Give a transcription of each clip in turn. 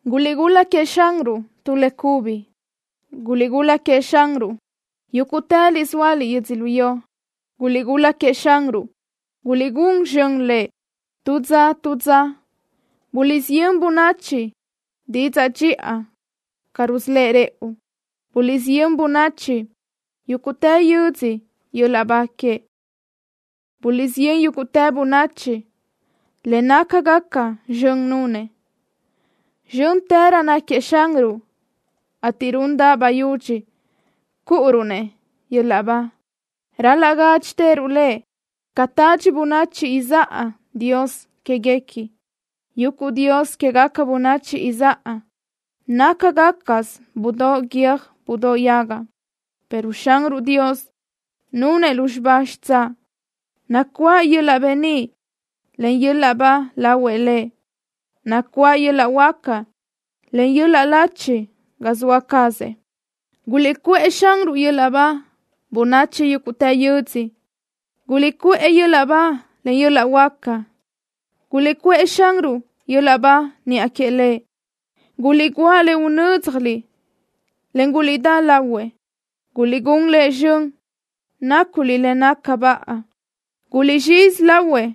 ¡Guliʼgul-la queëʼ Xanruʼ tu le cubi! ¡Guliʼgul-la queëʼ Xanruʼ, yúguʼtëliʼ zóaliʼ yödzölió! ¡Guliʼgul-la queëʼ Xanruʼ! ¡Guliʼgún zxön lëʼ! Tu dza tu dza buliʼsiyö́n bönachi didzaʼ dxiʼa ca rusölë́ʼ rëʼu. Buliʼsiyö́n bönachi yúguʼtë yödzö yöl-laʼ ba queëʼ. Buliʼsiyö́n yúguʼtë bönachi le nácagaca zxön nunëʼ. Zxö́ntërö náquiëʼ Xanruʼ, ateʼ rundaʼ bayúdx cúʼuruʼ-nëʼ yöl-laʼ ba. Ral-laʼ gádxitëruʼ Lëʼ ca tadxi bönachi izáʼa dios quéguequi. Yuguʼ dios quégaca bönachi izáʼa nácagacasö budóʼ guiö́j budóʼ yaga, pero Xanruʼ Dios nunëʼ lúzxiba xitsáʼ. Nacuáʼ yöl-laʼ beníʼ, en yöl-laʼ ba lahuëʼ Lëʼ. Nacuáʼ yöl-laʼ huáca, en yöl-laʼ lachi ga zoa cazëʼ. ¡Guliʼcuʼë Xanruʼ yöl-laʼ ba, bönachi yúguʼtë yödzö! ¡Guliʼcuʼë yöl-laʼ ba, en yöl-laʼ huáca! ¡Guliʼcuʼë Xanruʼ yöl-laʼ ba niʼa que Lëʼ! ¡Guliʼguáʼ le unö́dzjaliʼ, en guliʼdá lahuëʼ! ¡Guliʼgún Lëʼ zxön, náculiʼ le naca baʼa! ¡Guliʼzxizi lahuëʼ,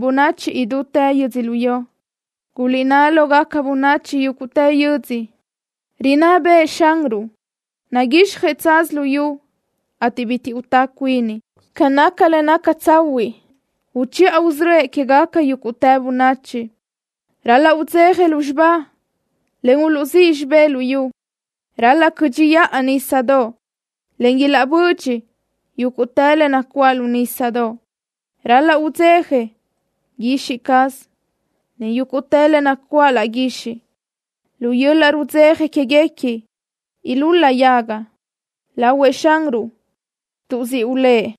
bönachi idútë yödzölió! Guliʼnná lógaca bönachi yúguʼtë yödzö: “Rinná bëʼë Xanruʼ. Naguixjëʼ tsaz luyú, ateʼ bitiʼ utá cuini. Ca naca le naca tsahuiʼ uchiʼa usörö́ëʼ quégaca yúguʼtë bönachi.” Ral-laʼ udzeja lúzxiba, en uluʼzíʼ xibé luyú. Ral-laʼ cö́dxiʼa nísadoʼ, en ilaʼbödxi yúguʼtë le nacuáʼ lu nísadoʼ. Ral-laʼ udzeja guixiʼ caz, en yúguʼtë le nacuáʼ laʼ guixiʼ. Lu yöl-laʼ rudzeja quéguequi ilúl-la yaga lahuëʼ Xanruʼ, tuʼ siʼ ulë́ʼ.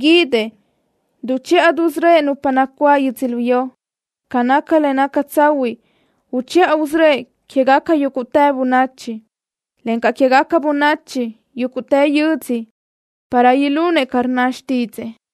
Guídëʼ duchiʼa dusörö́ëʼ nupa nacuáʼ yödzölió. Ca naca le naca tsahuiʼ uchiʼa usörö́ëʼ quégaca yúguʼtë bönachi, encaʼ quégaca bönachi yúguʼtë yödzö para ilunëʼ ca rnna xtídzëʼë.